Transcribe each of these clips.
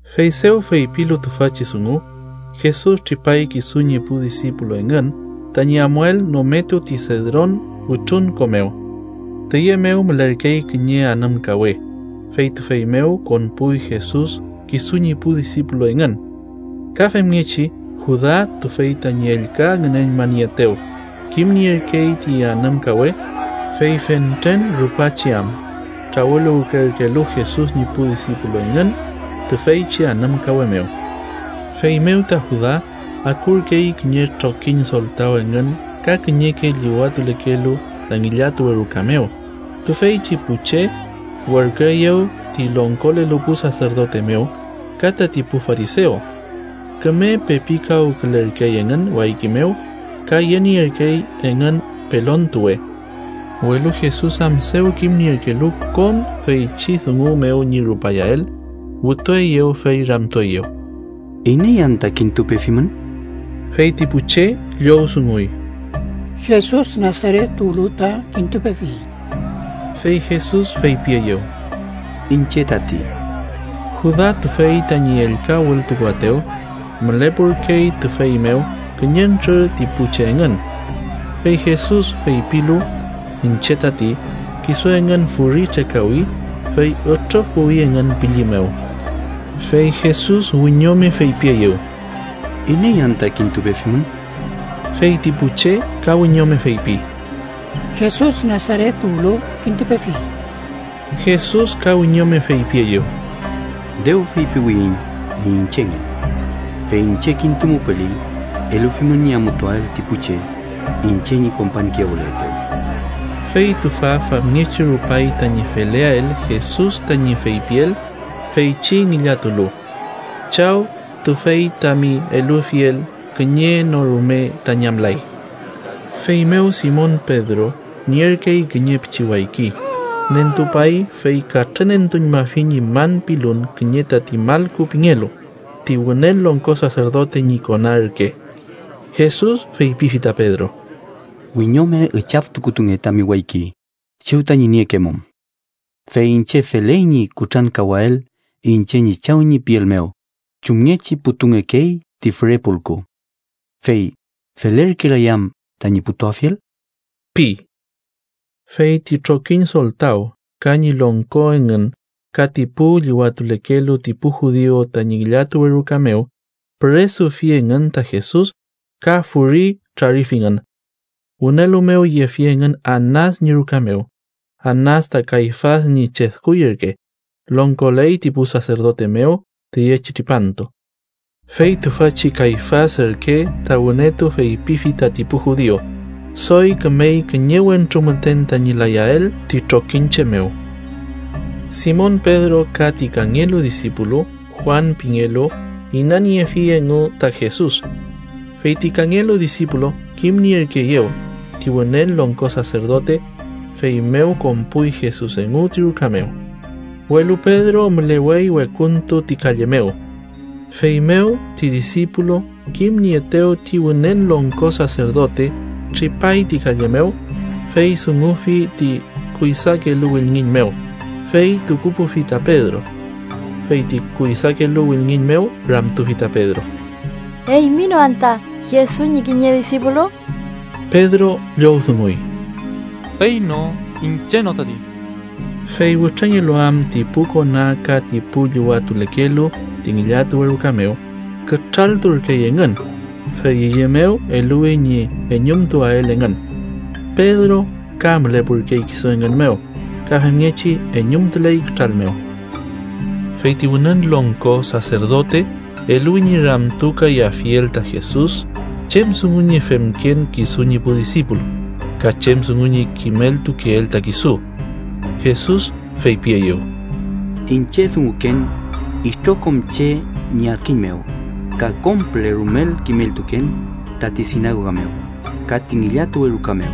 Fey dew feypilu tüfachi dungu, Jesus tripay kisu ñi pu disipulu engün tañi amuael nometu ti Sedron wütrunko mew. Tüye mew mülerkey kiñe anümkawe, fey tüfey mew konpuy Jesus kisu ñi pu disipulu engün. Ka femngechi Juda, tüfey tañi ellka ngünenmanieetew, kimnierkey ti anümkawe, fey fentren rupachi am trawüluwkerkelu Jesus ñi pu disipulu engün tüfeychi anümkawe mew. Feymew ta Juda akurkey kiñe trokiñ soltaw engün ka kiñeke llüwatulekelu ta ngillatuwe ruka mew, tüfeychi pu che werküeyew ti longkolelu pu saserdote mew ka tati pu farisew. Küme pepikawkülerkey engün wayki mew ka yenierkey engün pelontuwe. Welu Jesus am dew kimnierkelu kom feychi dungu mew ñi rupayael, wütueyew fey ramtueyew: —¿Iney anta kintupefimün? Fey ti pu che llowdunguy: —Jesus Nasaret tuwlu ta kintupefiyiñ. Fey Jesus feypieyew: —Iñche tati. Juda, tüfey tañi ellka wültukuaetew, mülepurkey tüfey mew kiñentrür ti pu che engün. Fey Jesus feypilu: “Iñche tati” kisu engün furi trekawi, fey ütrüfpuwi engün pülli mew. Fey Jesus wiñome feypieyew: —¿Iney anta kintupefimün? Fey ti pu che ka wiñome feypi: —Jesus, Nasaret tuwlu kintupefiyiñ. Jesus ka wiñome feypieyew: —Dew feypiwiyiñ ñi iñchengen. Fey iñche kintumupeli, elufimün ñi amutuael ti pu che iñche ñi kompañkiyawületew. Fey tüfa famngechi rupay tañi feleael Jesus tañi feypiel, feychi ngillatulu: “Chaw, tüfey tami elufiel kiñe no rume ta ñamlay.” Feymew Simon Pedro, nierkey kiñe pichi wayki, nentupay fey katrünentuñmafi ñi man pilun kiñe tati Malku pingelu, ti Wünen Longko Saserdote ñi kona ürke. Jesus feypifi ta Pedro: —Wiñome üchaftukutunge tami wayki chew tañi niekemum. Fey iñche feley ñi kutrankawael iñche ñi Chaw ñi piel mew chumngechi putungekey ti füre pulku. ¿Fey felerkelay am tañi putuafiel? ―pi. Fey ti trokiñ soltaw ka ñi longko engün ka ti pu llüwatulekelu ti pu judiu tañi ngillatuwe ruka mew, püresufi engün ta Jesus ka furi trarifingün. Wünelu mew yefi engün Anas ñi ruka mew, Anas ta Kayfas ñi chedkuy ürke, longkoley ti pu saserdote mew tüyechi tripantu. Fey tüfachi Kayfas ürke ta wünetu feypifi tati pu judiu, “doy kümey kiñe wentru müten tañi layael ti trokiñche mew.” Simon Pedro ka ti kangelu disipulu Juan pingelu inaniefi engu ta Jesus. Fey ti kangelu disipulu kimnierkeeyew ti Wünen Longko Saserdote, feymew konpuy Jesus engu ti ruka mew. Welu Pedro mülewey wekuntu ti kalle mew. Feymew, ti disipulu kimnieetew ti Wünen Longko Saserdote, tripay ti kalle mew, fey dungufi ti kuydakelu wülngiñ mew, fey tukupufi ta Pedro. Fey ti kuydakelu wülngiñ mew ramtufi ta Pedro: —¿Eymi no anta Jesus ñi kiñe disipulu? Pedro llowdunguy: —Fey no. Iñche no tati. Fey wütrengelu am ti pu kona ka ti pu llüwatulekelu ti ngillatuwe ruka mew, kütralturkey engün, fey üye mew eluwi ñi eñumtuael engün. Pedro ka mülepurkey kisu engün mew ka femngechi eñumtuley kütral mew. Fey ti Wünen Longko Saserdote eluwi ñi ramtukayafiel ta Jesus chem dungu ñi femken kisu ñi pu disipulu ka chem dungu ñi kimeltukeel ta kisu. Jesus feypieyew: —Iñche dunguken itrokom che ñi adkiñ mew ka kom püle rumel kimeltuken tati sinagoga mew ka ti ngillatuwe ruka mew,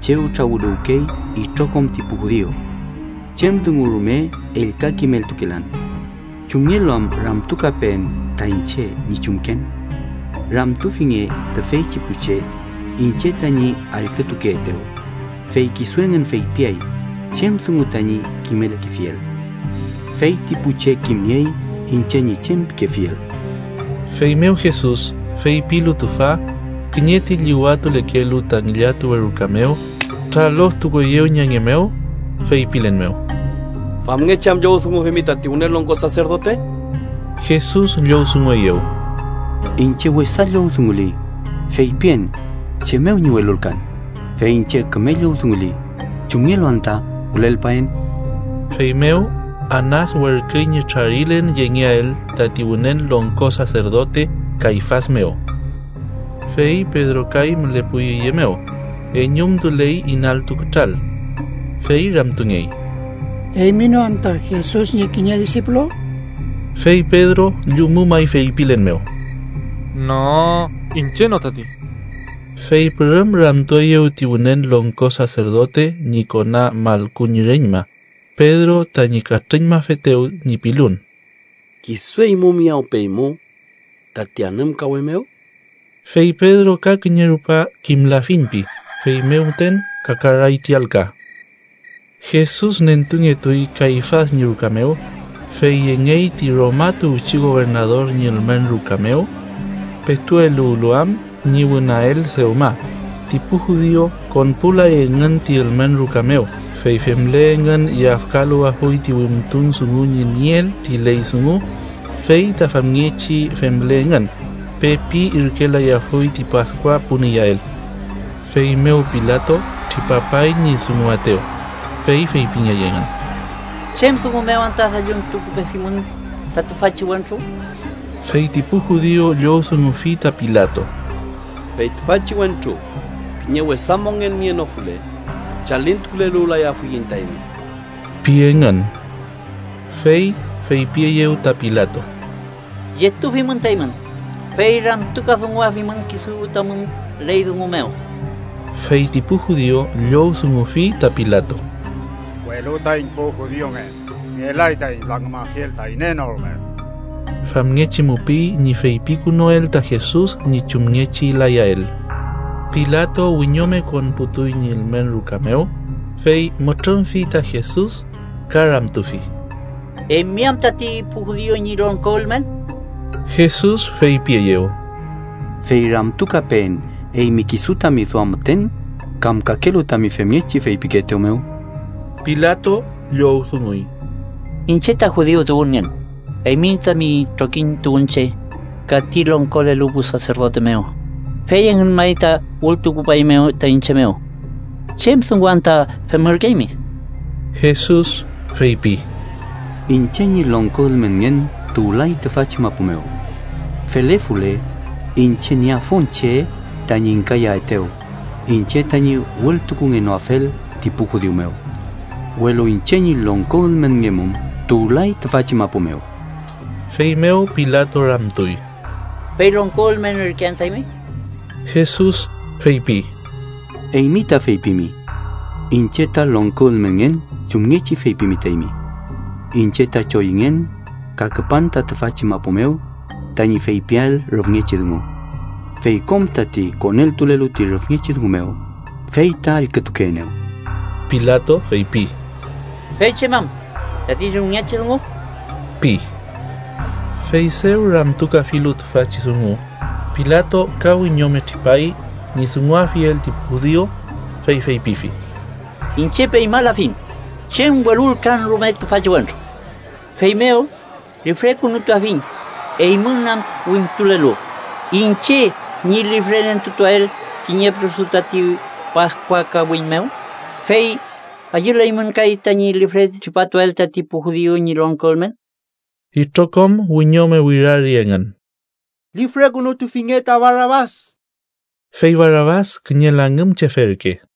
chew trawüluwkey itrokom ti pu judiu. Chem dungu rume ellka kimeltukelan. ¿Chumngelu am ramtukapeen ta iñche ñi chumken? Ramtufinge tüfeychi pu che iñche tañi allkütukeetew, fey kisu engün feypiay chem dungu tañi kimelkefiel. Feyti pu che kimniey iñche ñi chem pikefiel. Feymew Jesus, feypilu tüfa, kiñe ti llüwatulekelu ta ngillatuwe ruka mew traloftukueyew ñi ange mew, feypilen mew: —¿Famngechi am llowdungufimi tati Wünen Longko Saserdote? Jesus llowdungueyew: —Iñche wesa llowdunguli, feypien chem mew ñi welulkan, fey iñche küme llowdunguli, ¿chumngelu anta wülelpaen? Feymew Anas werküy ñi trarilen yengeael tati Wünen Longko Saserdote Kayfas mew. Fey Pedro kay mülepuy üye mew, eñumtuley inaltu kütral. Fey ramtungey: —¿Eymi no anta Jesus ñi kiñe disipulu? Fey Pedro llumumay feypilen mew: —No, iñche no tati. Fey pürüm ramtueyew ti Wünen Longko Saserdote ñi kona Malku ñi reñma, Pedro tañi katrüñmafetew ñi pilun: —¿Kisu eymu miyawpeymu tati anümkawe mew? Fey Pedro ka kiñe rupa “kimlafiñ” pi, feymew müten kakaray ti alka. Jesus nentungetuy Kayfas ñi ruka mew, fey yengey ti Roma tuwchi gobernador ñi ülmen ruka mew. Petu eluwlu am ñi wünael dewma, ti pu judiu konpulay engün ti ülmen ruka mew, fey femle engün yafkaluwafuy ti wimtun dungu ñi nieel ti ley dungu fey ta famngechi femle engün, pepi irkelayafuy ti Paskua pun iyael. Feymew Pilato tripapay ñi dunguaetew, fey feypingey engün: —¿Chem dungu mew anta dalluntukupefimün ta tüfachi wentru? Fey ti pu judiu llowdungufi ta Pilato: —Fey tüfachi wentru kiñe wesa mongen nienofule, chalintukuleluwlayafuiñ ta eymi ―pi engün. Fey feypieyew ta Pilato: —Yetufimün ta eymün, fey ramtukadunguafimün kisu tamün ley dungu mew. Fey ti pu judiu llowdungufi ta Pilato: —Welu taiñ pu judiungen, ngelay taiñ langümafiel ta iney no rume. Famngechi mupiy ñi feypikünuel ta Jesus ñi chumngechi layael. Pilato wiñome konputuy ñi ülmen ruka mew, fey mütrümfi ta Jesus ka ramtufi: —¿Eymi am tati pu judiu ñi longko ülmen? Jesus feypieyew: —¿Fey ramtukapeen eymi kisu tami duam müten, kam kakelu tañi femngechi feypikeetew mew? Pilato llowdunguy: —¿Iñche ta judiu tuwünngen? Eymi tami trokiñ tuwünche ka ti longkolelu pu saserdote mew, fey engün may ta wültukupaeymew ta iñche mew. ¿Chem dungu anta femürkeymi? Jesus feypi: —Iñche ñi longko ülmenngen tuwlay tüfachi mapu mew. Felefule, iñche nieafun che tañi ingkayaetew iñche tañi wültukungenoafel ti pu judiu mew. Welu iñche ñi longko ülmenngemum tuwlay tüfachi mapu mew. Feymew Pilato ramtuy: —¿Fey longko ülmen ürke anta eymi? Jesus feypi: —Eymi ta feypimi. Iñche ta longko ülmenngen chumngechi feypimi ta eymi. Iñche ta choyüngen ka küpan ta tüfachi mapu mew tañi feypiael rüfngechi dungu. Fey kom tati koneltulelu ti rüfngechi dungu mew, fey ta allkütukeenew. Pilato feypi: —¿Fey chem am tati rüfngechi dungu? ―pi. Fey dew ramtukafilu tüfachi dungu, Pilato ka wiñome tripay ñi dunguafiel ti pu judiu, fey feypifi: —Iñche peñmalafiñ chem welulkan rume tüfachi wentru. Feymew lifrekünutuafiñ eymün am wimtulelu iñche ñi lifrenentutuael kiñe püresu tati Paskua kawiñ mew, fey ¿ayüleymün kay tañi lifre tripatuael tati pu judiu ñi longko ülmen? Itrokom wiñome wirari engün: —¡Lifrekünutufinge ta Barabas! Fey Barabas kiñe langümchefe ürke.